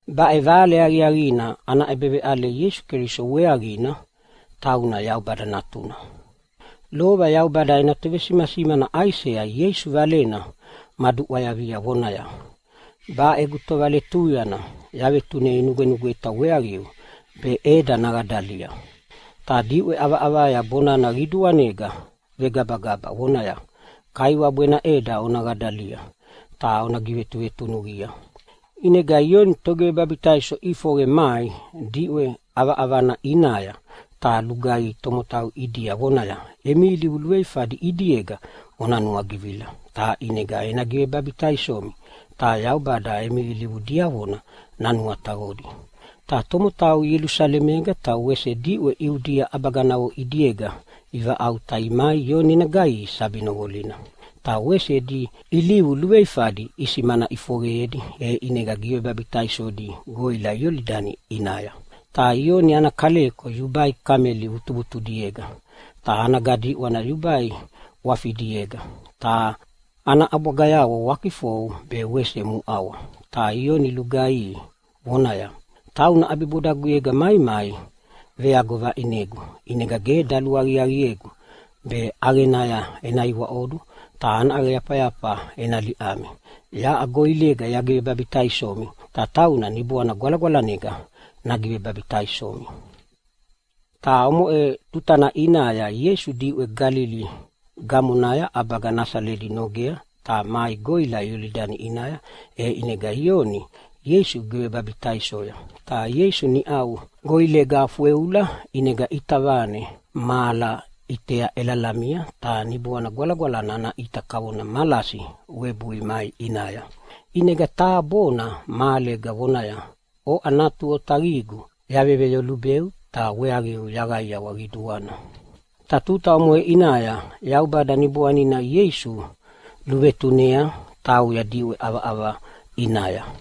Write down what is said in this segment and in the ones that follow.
Baʼe Vale Aqiaqina ana ʼebeveʼale Ieisu Keliso weaqina, tauna Yaubada Natuna. Lova Yaubada ena tovesimasimana Aisea Ieisu Valena maduʼwayavia vonaya, “Baʼe egu tovaletuyana yavetunei nugwenugweta weaqiu be ʼeda naqadalia. Ta diʼwe ʼavaʼavaya bonana qiduanega vegabagaba, vonaya, ‘Kaiwabu ena ʼeda ona qadalia ta ona givetuvetunuqia.’” ʼInega Ioni Togivebabitaiso ʼifoqe mai diʼwe ʼavaʼavana ʼinaya ta lugaihi tomotau ʼidia vonaya, “Emi ilivu luveifadi ʼidiega ona nuagivila ta ʼinega ena givebabitaisomi ta Yaubada emi ilivu diavona nanuataqodi.” Ta tomotau Ielusalemega ta wese diʼwe Iudia ʼabaganavo ʼidiega ivaʼauta imai Ioni ena gaihi sabi noqolina. Ta wese edi ilivu luveifadi isimana ʼifoqeyedi, e ʼinega givebabitaisodi goʼila Iolidani ʼinaya. Ta Ioni ana kaleko yubai kameli vutuvutudiega, ta ana gadiʼwana yubai ʼwafidiega, ta ana ʼabwagayavo wakifou be wese muʼawa. Ta Ioni lugaihi vonaya, “Tauna ʼabibodaguyega maimai veago vaʼinegu, ʼinega ge daluaqiaqiegu be ʼaqenaya ena iwaʼodu ta ana ʼaqeyafayafa ena liʼami. Yaʼa goʼilega yagigivebabitaisomi ta tauna Niboana Gwalagwalanega nagivebabitaisomi.” Ta omoʼe tutana ʼinaya Ieisu diʼwe Galili gamonaya ʼabaga Nasaleta nogea ta mai goʼila Iolidani ʼinaya, e ʼinega Ioni Ieisu givebabitaisoya. Ta Ieisu niʼau goʼilega fweula, ʼinega ʼita vane mahala ʼitea ʼelalamia, ta Niboana Gwalagwalana ana ʼita kavona malasi webui mai ʼinaya. ʼInega taha bona mahalega vonaya, “Oʼa Natu aqiaqigu yaveloyubeu ta weaqiu yaqaiawa qiduana.” Ta tuta omoʼe ʼinaya Yaubada Niboanina Ieisu luvetunea tauya diʼwe ʼavaʼava ʼinaya.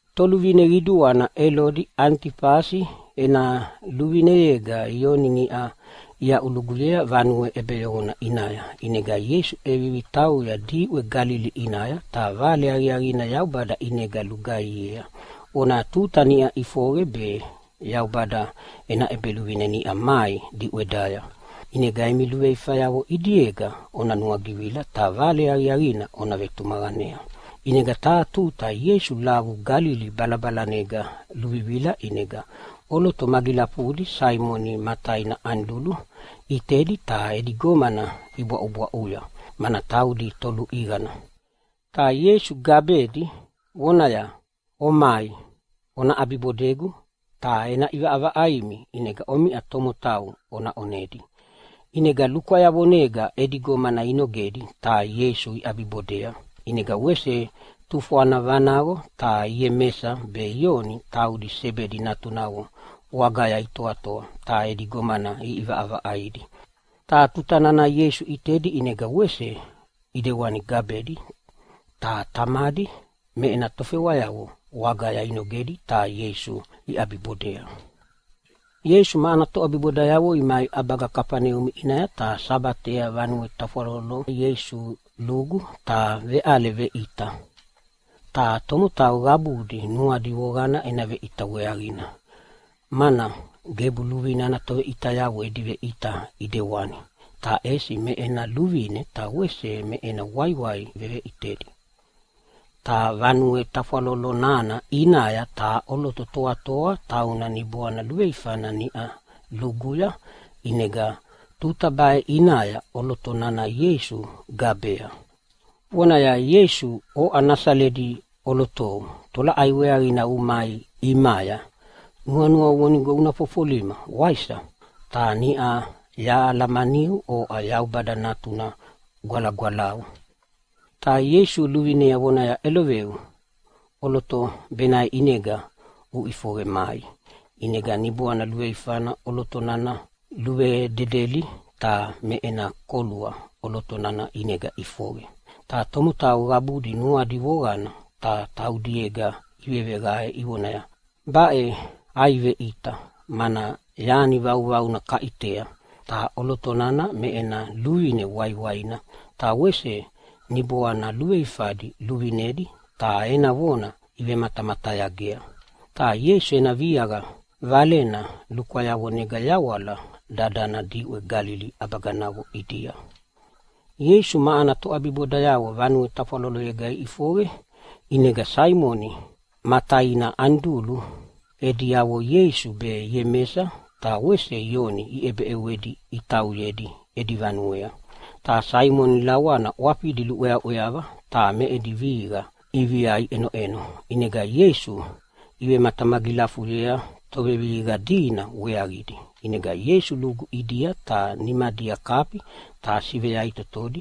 Toluvine qiduana Elodi Anitifasi ena luvineyega Ioni niʼa iaʼuluguyea vanue ʼebeyoqona ʼinaya. ʼInega Ieisu ʼevivi tauya diʼwe Galili ʼinaya ta Vale Aqiaqina Yaubada ʼinega lugaihiea, vonaya, “Tuta niʼa ʼifoqe, be Yaubada ena ʼEbeluvine niʼa mai diʼwedaya. ʼInega emi luveifayavo ʼidiega ona nuagivila ta Vale Aqiaqina ona vetumaqanea!” ʼInega taha tuta Ieisu lavu Galili balabalanega luluvivila, ʼinega ʼoloto magilafudi Saimoni ma taina Anidulu ʼitedi ta edi gomana ibwaʼubwaʼuya, mana taudi toluʼiqana. Ta Ieisu gabedi vonaya, “Omai, ona ʼabibodegu ta ena ʼivaʼavaʼaimi ʼinega omiʼa tomotau ona ʼonedi.” ʼInega lukwayavonega edi gomana inogedi ta Ieisu iʼabibodea. ʼInega wese tufwana vanaqo ta Iemesa be Ioni, taudi Sebedi natunavo wagaya itoatoa ta edi gomana iʼivaʼavaʼaidi. Ta tuta nana Ieisu ʼitedi ʼinega wese ʼidewani gabedi, ta tamadi me ena tofewayavo wagaya inogedi ta Ieisu iʼabibodea. Ieisu ma ana toʼabibodayavo imai ʼabaga Kafaneumi ʼinaya ta Sabatea vanue tafwaloloya Ieisu lugu ta veʼale veʼita. Ta tomotau qabudi nuadi voqana ena veʼita weaqina, mana gebu luvine ana toveʼitayavo edi veʼita ʼidewani, ta ʼesi me ena luvine ta wese me ena waiwai veveʼitedi. Ta vanue tafwalolo nana ʼinaya taha ʼoloto toatoa, tauna niboana luveifana niʼa luguya, ʼinega tuta baʼe ʼinaya ʼoloto nana Ieisu gabea, vonaya, “Ieisu, oʼa Nasaleta ʼolotou, tolaʼai weaqina umai ʼimaya? Nuanuau vonigo una fofolima, waisa? Ta niʼa yahalamaniu, oʼa Yaubada Natuna Gwalagwalau.” Ta Ieisu luvinea vonaya, “ʼEloveu! ʼOloto benaʼe ʼinega uʼifoqe mai!” ʼInega niboana luveifana ʼoloto nana luvededeli, ta me ena kolua ʼoloto nana ʼinega ʼifoqe. Ta tomotau qabudi nuadi voqana ta taudiega iveveqae ivonaya, “Baʼe ai veʼita, mana yani vauvauna kaʼitea! Ta ʼoloto nana me ena luvine waiwaina, ta wese niboana luveifadi luvinedi ta ena vona ivematamatayagea.” Ta Ieisu ena viaqa valena lukwayavonega yawala dadana diʼwe Galili ʼabaganavo ʼidia. Ieisu ma ana toʼabibodayavo vanue tafwaloloyega iʼifoqe, ʼinega Saimoni ma taina Anidulu ediavo Ieisu be Iemesa ta wese Ioni iʼebeʼewedi itauyedi edi vanuea. Ta Saimoni lawana ʼwafidi luʼweaʼweava ta me edi vihiqa ʼivia iʼenoʼeno, ʼinega Ieisu ivematamagilafuyea tovevihiqa dina weaqidi. ʼInega Ieisu lugu ʼidia ta nimadia kafi ta siveyaʼitotodi,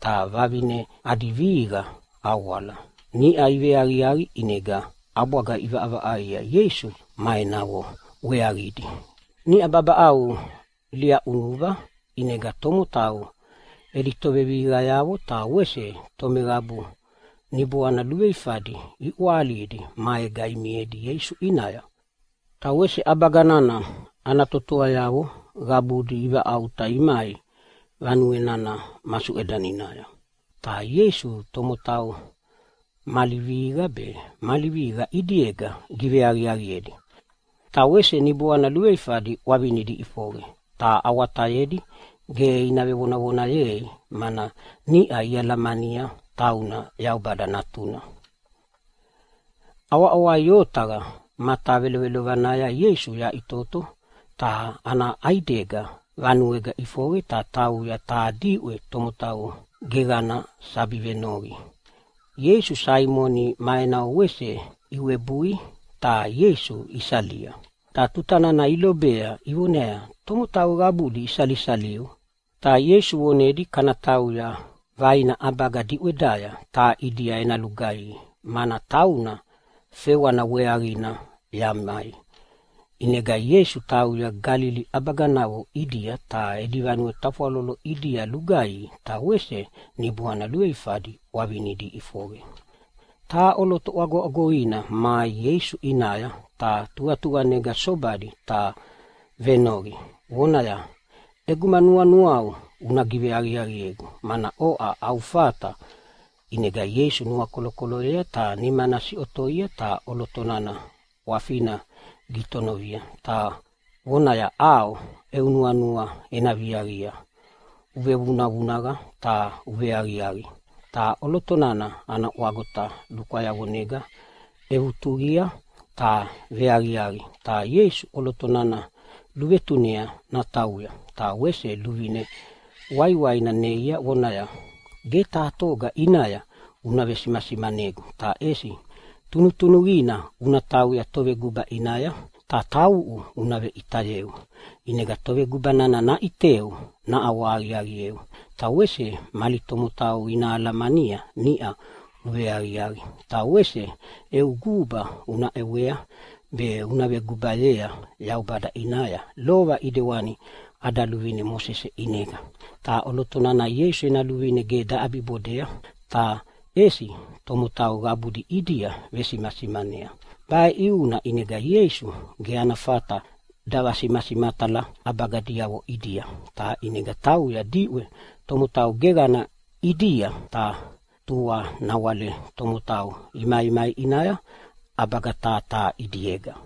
ta vavine adi vihiqa awala. Niʼa iveaqiaqi ʼinega ʼabwaga iʼivaʼavaʼaia Ieisu ma enavo weaqidi. Niʼau babaʼau lia ʼunuva ʼinega tomotau edi tovevihiqayavo ta wese tomeqabu niboana luveifadi iʼwahalidi maega imiedi Ieisu ʼinaya. Ta wese ʼabaga nana ana totoayavo qabudi ivaʼauta imai vanue nana masuʼedaninaya. Ta Ieisu tomotau mali vihiqa be mali vihiqa ʼidiega giveaqiaqiedi. Ta wese niboana luveifadi ʼwavinidi iʼifoqe ta awatayedi ge ina vevonavonayei, mana niʼa ialamania tauna Yaubada Natuna. ʼAwaʼawai otaqa matavelovelovanaya Ieisu yaʼitoto ta ana ʼaidega vanuega ʼifoqe, ta tauya taha diʼwe tomotau geqanaya sabi venoqi. ʼInega Saimoni ma enavo wese iwebui, ta Ieisu isalia. Ta tuta nana ilobea ivoneaya, “Tomotau qabudi isalisaliu!” Ta Ieisu vonedia, “Kana tauya vaina ʼabaga diʼwedaya, ta ʼidia ena lugaihi, mana tauna fewana weaqina yamai.” ʼInega Ieisu tauya Galili ʼabaganavo ʼidia ta edi vanue tafwalolo ʼidia lugaihi ta wese niboana luveifadi ʼwavinidi iʼifoqe. Taha ʼoloto ʼwagoʼwagoina mai Ieisu ʼinaya ta tuqatuqanega sobadi ta venoqi vonaya, “ʼEguma nuanuau una giveaqiaqiegu, mana oʼa au fata.” ʼInega Ieisu nuakolokoloyea ta nimana siʼotoia ta ʼoloto nana ʼwafina gitonovia ta vonaya, “ʼAo eu nuanua ena viaqia, uvevunavunaqa ta uveaqiaqi!” Ta ʼoloto nana ana ʼwagota lukwayavonega ʼevutuqia ta veaqiaqi. Ta Ieisu ʼoloto nana luvetunea natauya ta wese luvine waiwaina neia vonaya, “Ge taha toga ʼinaya una vesimasimanegu, ta ʼesi tunutunuqina una tauya toveguba ʼinaya ta tauʼu una veʼitayeu. ʼInega toveguba nana naʼiteu naʼawahaqiaqieu, ta wese mali tomotau ina alamania niʼa uveaqiaqi. Ta wese eu guba una ʼewea be una vegubayea Yaubada ʼinaya, lova ʼidewani ada luvine Mosese ʼinega.” Ta ʼoloto nana Ieisu ena luvine ge daʼabibodei, ta ʼesi tomotau qabudi ʼidia vesimasimanea. Baʼe ʼiuna ʼinega Ieisu ge ana fata davasimasimatala ʼabaga diavona ʼidia, ta ʼinega tauya diʼwe tomotau geqana ʼidia. Ta tua nawale tomotau imaimai ʼinaya ʼabaga taha taha ʼidiega.